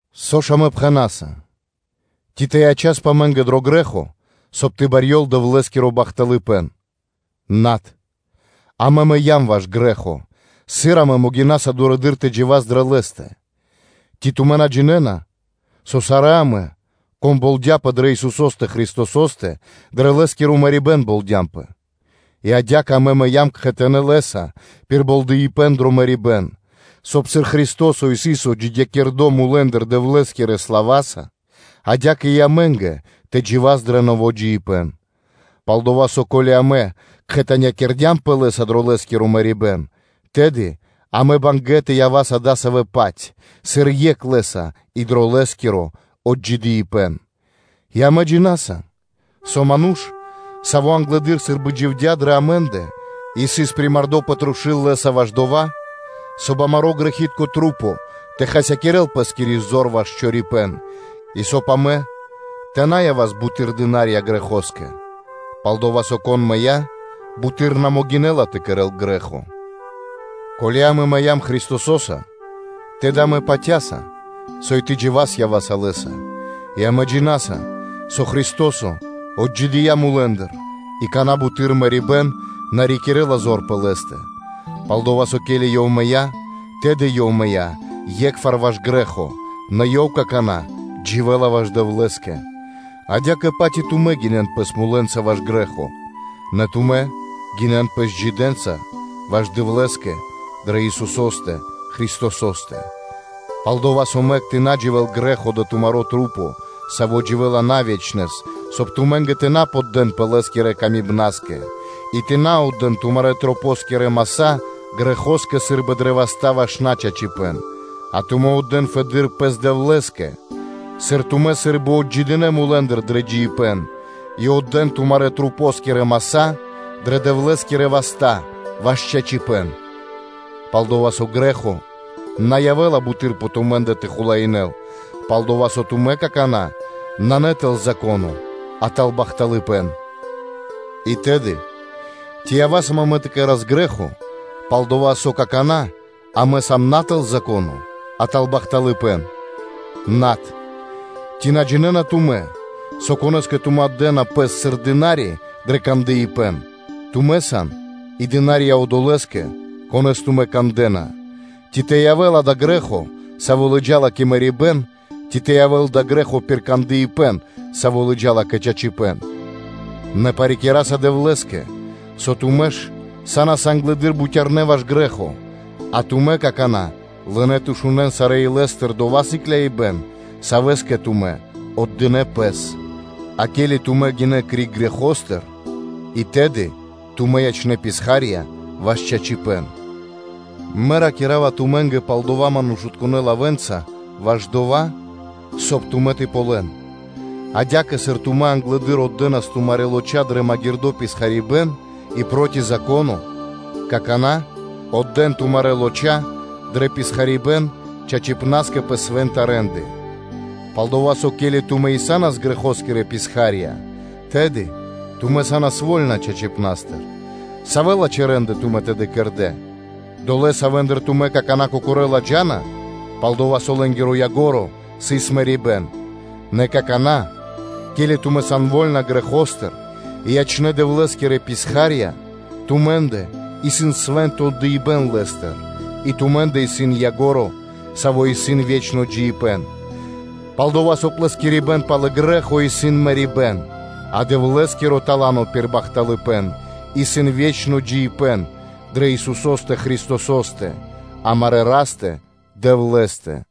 Со ж амэ пхэна́са? Ци тэ ячаспэ амэ́нгэ дро грэ́хо, соб (кай) тэ барьёл Дэвлэ́скиро бахталыпэ́н? Над. Амэ мыям ваш грэ́хо, сыр амэ могинаса дурэды́р тэ джива́с дрэ лэ́стэ? Ци тумэ́ на джинэ́на, со сарэ́ амэ, кон болдяпэ дрэ Исусо́стэ Христосо́стэ, дрэ Лэ́скиро мэрибэ́н болдямпэ? И адя́кэ амэ мыям кхэтанэ́ Лэ́са пир болдыипэн дрэ мэрибэ́н, соб (кай), сыр Христо́со сыс отджидякирдо мулэ́ндыр Дэвлэ́скирэ слава́са, адя́кэ и амэ́нгэ тэ джива́с дрэ нэво́ джиибэ́н. Пал-дова́ со, ко́ли амэ кхэтанякирдямпэ Лэ́са дро Лэ́скиро мэрибэ́н, тэды амэ сам бангэ́ (мусинаса) тэ явас адасавэ́-паць, сыр екх Лэ́са и дро Лэ́скиро отджидыибэн, и амэ джина́са, со ману́ш, саво́ англэды́р сы́рбы дживдя́ дрэ амэ́ндэ, сыс примардо пэ трушу́л Лэ́са ваш дова́, соб (кай) амарэ́ грэхи́тка маса́ тэ хасякирэ́н пэ́скири зор ваш чорипэ́н, и соб (кай) амэ тэ на явас буты́р дына́рья грэхо́скэ. Пал-дова́ со, кон мыя́, буты́р на могинэ́ла тэ кэрэ́л грэ́хо. Ко́ли амэ мыям Христосо́са, тэды амэ патя́са, со и тэ джива́с ява́са Лэ́са, и амэ джина́са, со Христо́со отджидыя́ мулэ́ндыр, и какана́ буты́р мэрибэ́н на рикирэ́ла зор пэ Лэ́стэ. Пал-дова́ со, ке́ли Ёв мыя́, тэды Ёв мыя́ е́кхвар ваш грэ́хо, нэ Ёв какана́ дживэ́ла ваш Дэвлэ́скэ. Адя́кэ-паць и тумэ́ гинэн пэс мулэ́нца ваш грэ́хо, нэ тумэ́ гинэн пэс джидэ́нца ваш Дэвлэ́скэ дрэ Исусо́стэ Христосо́стэ. Пал-дова́ со, мэк тэ на дживэ́л грэ́хо дрэ тумарэ́ маса́, саво́ дживэ́ла на ве́чнэс, соб (кай) тумэ́нгэ тэ на поддэнпэ лэ́скирэ тырдыпнаскэ. И на отдэ́н тумарэ́ маса́ грэхо́скэ сы́рбы дрэ васта́ ваш начачипэ́н, а тумэ́ отдэ́н фэды́р пэс Дэвлэ́скэ, сыр тумэ́ сы́рбы отджидынэ мулэ́ндыр дрэ джиибэ́н, и отдэ́н тумарэ́ маса́ дрэ Дэвлэ́скирэ васта́ ваш чачипэ́н. Пал-дова́ со грэ́хо на явэ́ла буты́р пэ тумэ́ндэ тэ хулаинэ́л: пал-дова́ со тумэ́ какана́ сан на тэл Зако́но, а тэл бахталыпэ́н. И тэды, ци ява́са амэ тэ кэра́с грэ́хо, пал-дова́ со какана́ амэ сам на тэл Зако́но, а тэл бахталыпэ́н? Над. Ци на джинэ́на тумэ́, со конэ́скэ тумэ́ отдэна пэс сыр дына́ри дрэ кандыпэн, тумэ́ сан и дына́рья одолэ́скэ, конэ́с тумэ́ кандэ́на: ци тэ явэ́л дава́ грэ́хо, саво́ лыджа́ла кэ мэрибэ́н, ци тэ явэ́л дава́ грэ́хо пир кандыпэн, саво́ лыджа́ла кэ чачипэ́н? Нэ парикираса Дэвлэ́скэ, со тумэ́ ж са́нас англэды́р бутярнэ́ ваш грэ́хо, а тумэ́ какана́ лынэ́ тэ шунэ́н сарэ́ илэ́стыр дова́ сыкляибэн, савэ́скэ тумэ́ отдынэ́ пэс. А ке́ли тумэ́ гинэ́ криг грэхостыр, и тэды тумэ́ ячнэ́ писхарьёнца ваш чачипэ́н. Мэ ракира́ва тумэ́нгэ пал дава́ манушытконэ́ лавэ́нца, ваш дова́, соб (кай) тумэ́ тэ ґалён. Адя́кэ, сыр тумэ́ англэды́р отдэнас тумарэ́ лочакирэ маса́ дрэ магирдо́ писхарибэн и проти Зако́но, то какана́ отдэ́н тумарэ́ маса́ дрэ писхарибэн чачипнаскэ пэ свэ́нта рэ́нды. Пал-дова́ со, ко́ли тумэ́ и са́нас грэхоскирэ писха́рья, тэды тумэ́ са́нас вольна чачипнастыр. Савэ лачхэ́ рэ́нды тумэ́ тэды кэрдэ́? Долэ́, савэ́ндыр тумэ́ какана́ кокорэ́ ладжана, пал-дова́ со лэ́нгиро ко́нцо (яго́ро) исыс мэрибэ́н. Нэ какана́, ке́ли тумэ́ сан вольна грэхостыр и ячнэ́ Дэвлэ́скирэ писхарье́нца, тумэ́ндэ исын свэ́нто отдыибэ́н Лэ́стыр и тумэ́ндэ исын ко́нцо (яго́ро) пэ дава́, саво́ исын ве́чно джиибэ́н. Пал-дова́ со плэскирибэн пал грэ́хо исын мэрибэ́н, а Дэвлэ́скиро тала́но пир бахталыпэ́н исын ве́чно джиибэ́н дрэ Исусо́стэ Христосо́стэ, амарэ́ Растэ-Дэвлэ́стэ.